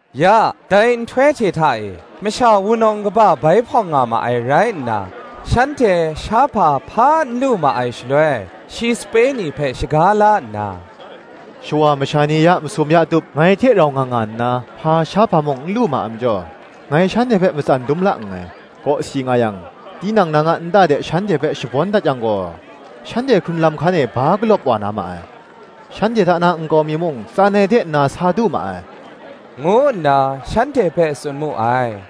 Ya, dai nhtoi hte hta e, masha wunawng kaba bai hpawng nga ma ai rai nna, shanhte shahpa hpa n lu ma ai shaloi, shi sape ni hpe shaga la nna, “Shawa masha ni ya masum ya tup ngai hte rau nga nga nna, hpa shahpa mung n lu ma ai majaw, ngai shanhte hpe matsan dum la nngai: Kawsi nga yang, tinang nang a nta de shanhte hpe shabawn dat yang gaw, shanhte hkrun lam hkan e ba galawp wa na ma ai: shanhte hta na nkau mi mung tsan ai de nna sa du ma ai,” ngu nna shanhte hpe tsun mu ai.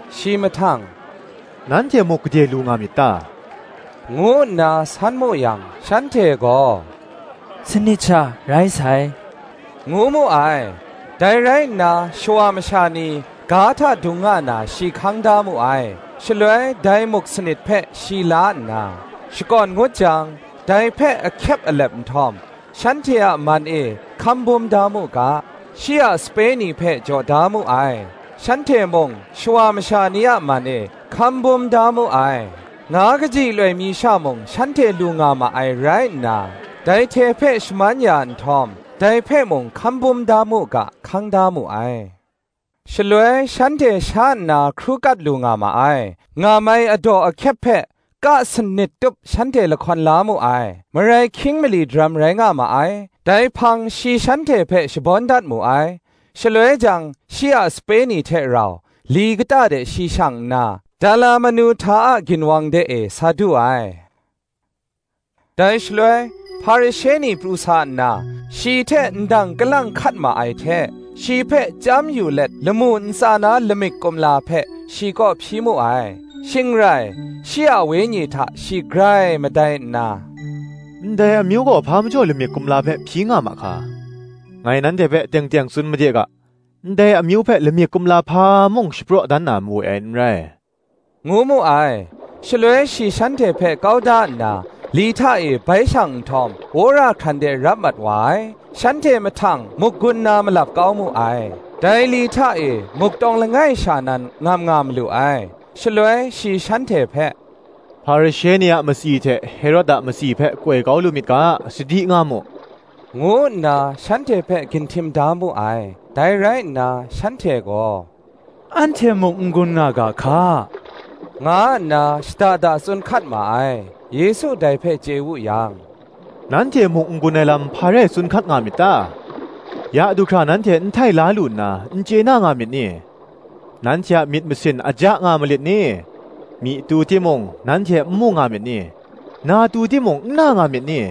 Shi mahtang, “Nanhte muk gade lu nga myit ta?” ngu nna san mu yang, shanhte gaw, “Sanit sha rai sai,” ngu mu ai. Dai rai nna shawa masha ni ga hta dung nga na shi hkang da mu ai: shaloi dai muk sanit hpe shi la nna, shakawn ngut jang, dai hpe ahkyep alep nhtawm, shanhte a man e hkambum da mu ga, shi a sape ni hpe jaw da mu ai: shanhte mung, shawa masha ni a man e, hkambum da mu ai. Nga kaji loi mi sha mung shanhte lu nga ma ai rai nna, dai hte hpe shaman ya nhtawm, dai hpe mung hkambum da mu ga, hkang da mu ai. Shaloi shanhte sha nna hkru kat lu nga ma ai; ngam ai adaw ahkyep hpe ka sanit tup shanhte lahkawn la mu ai. Marai hkying mali daram rai nga ma ai; dai hpang shi shanhte hpe shabawn dat mu ai. Shaloi jang shi a sape ni hte rau li kata de shi shang nna, Dalamanuhta ginwang de e sa du ai. Dai shaloi Hparishe ni pru sa nna, shi hte ndang kalang hkat ma ai hte, shi hpe chyam yu let lamu ntsa na lamik kumla hpe, shi kaw hpyi mu ai. Shing rai shi a wenyi hta shi grai madai nna, “Ndai amyu gaw hpa majaw lamik kumla hpe hpyi nga ma hka? ngai nanhte hpe teng teng tsun made ga, ‘Ndai amyu hpe lamik kumla hpa mung, shapraw dan na mawe ai n rai,” ngu mu ai. Shaloi shi shanhte hpe kau da nna, li hta e bai shang nhtawm, wora hkran de rap mat wa ai. Shanhte mahtang muk gun na malap kau mu ai, dai li hta e muk tawng langai sha nan, ngam nga malu ai. Shaloi shi shanhte hpe, “Hparishe ni a matsi hte Herod a matsi hpe koi kau lu myit ga, sadi nga mu,” ngu nna shanhte hpe ginhtim da mu ai. Dai rai nna, shanhte gaw, “Anhte muk n gun nga ga hka,” nga nna shada da tsun hkat ma ai. Yesu dai hpe chye wu yang, “Nanhte muk n gun ai lam, hpa rai tsun hkat nga myit ta? ya du hkra nanhte n htai la lu nna, n chye na nga myit ni? nanhte a myit masin aja nga malit ni? myi tu timung, nanhte n mu nga myit ni? na tu timung n na nga myit ni?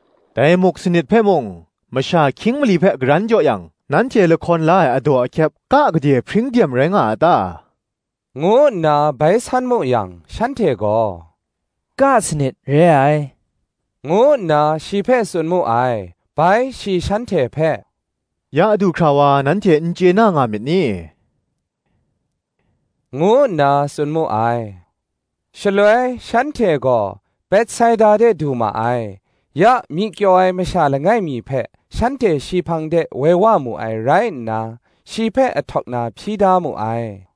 “Dai muk sanit hpe mung, masha hkying mali hpe karan jaw yang, nanhte lahkawn la ai adaw ahkyep ka gade hpring dem rai nga a ta?” ngu nna bai san mu yang, shanhte gaw, “Ka sanit re ai,” ngu nna shi hpe tsun mu ai. Bai shi shanhte hpe, “Ya du hkra wa nanhte n chye na nga myit ni?” ngu nna tsun mu ai. Shaloi shanhte gaw Betsaida de du ma ai. Ya, myi kyaw ai masha langai mi hpe shanhte shi hpang de woi wa mu ai rai nna, shi hpe ahtawk na hpyi da mu ai.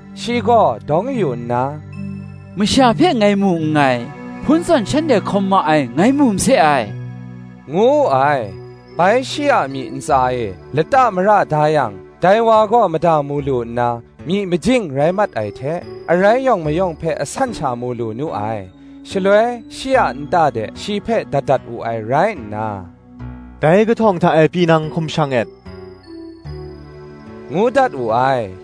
Shi gaw dawng yu nna, “Masha hpe ngai mu nngai; hpun zawn shanhte hkawm ma ai ngai mu mase ai,” ngu wu ai. Bai shi a myi ntsa e, lata mara da yang, dai wa gaw mada mu lu nna, myi majing rai mat ai hte, arai yawng mayawng hpe asan sha mu lu nu ai. Shaloi shi a nta de shi hpe dat dat wu ai rai nna, “Dai kahtawng hta e pyi nang hkum shang et,” ngu dat wu ai.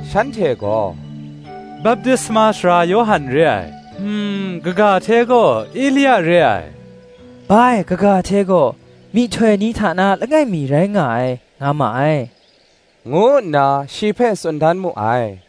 Shanhte gaw, “Baptisma Sara Yawhan re ai; kaga hte gaw, Elia re ai; bai, kaga hte gaw, Myihtoi ni hta na langai mi rai nga ai, nga ma ai,” ngu nna shi hpe tsun dan mu ai.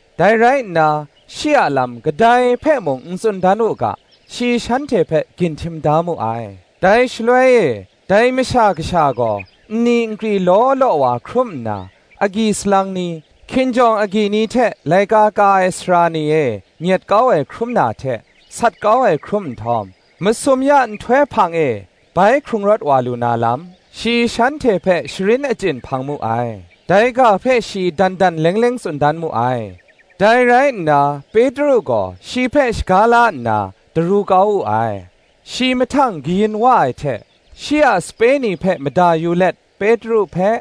Dai rai nna, shi a lam kadai hpe mung n tsun dan u ga, shi shanhte hpe ginhtim da mu ai. Dai shaloi e, Dai Masha Kasha gaw nni nkri law law wa hkrum nna, agyi salang ni, hkinjawng agyi ni hte laika ka ai sara ni e nyet kau ai hkrum na hte, sat kau ai hkrum nhtawm, masum ya nhtoi hpang e bai hkrung rawt wa lu na lam, shi shanhte hpe sharin achyin hpang mu ai. Dai ga hpe shi dan dan leng leng tsun dan mu ai. Dai rai nna Petru gaw shi hpe shaga la nna, daru kau wu ai. Shi mahtang kayin wa ai hte, shi a sape ni hpe mada yu let Petru hpe,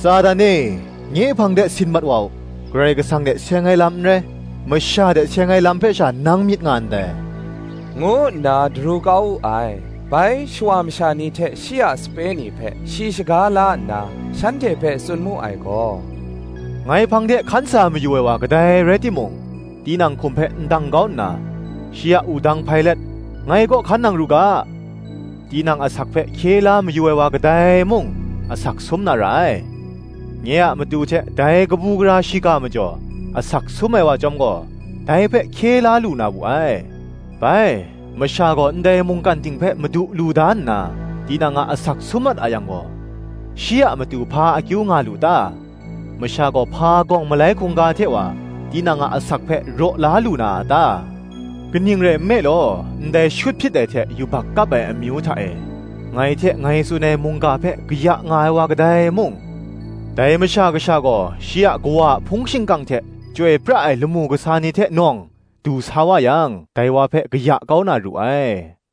“Satan e nye a hpang de sit mat wa u; Karai Kasang hte seng ai lam n rai, masha hte seng ai lam hpe sha nang myit nga ndai,” ngu nna daru kau wu ai. Bai shawa masha ni hte shi a sape ni hpe shi shaga la nna shanhte hpe tsun mu ai gaw, “Ngai hpang de hkan sa mayu ai wa kadai rai timung, tinang hkum hpe ndang kau nna, shi a wudang hpai let, ngai kaw hkan nang ru ga. Tinang asak hpe hkye la mayu ai wa kadai mung, asak sum na ra ai: nye a matu hte, dai kabu gara shiga majaw, asak sum ai wa chyawm gaw, dai hpe hkye la lu na wu ai. Bai, masha gaw ndai mungkan ting hpe madu lu da nna, tinang a asak sum mat a yang gaw, shi a matu hpa akyu nga lu ta? masha gaw hpa gawng malai hkungga hte wa, tinang a asak hpe raw la lu na a ta? Kaning rai nme law, ndai shut hpyit ai hte yubak kap ai amyu hta e, ngai hte ngai tsun ai mungga hpe kaya nga ai wa kadai mung, dai Masha Kasha gaw shi a Kawa a hpung shingkang hte chyoi pra ai lamu kasa ni hte nawng du sa wa yang, dai wa hpe kaya kau na ru ai.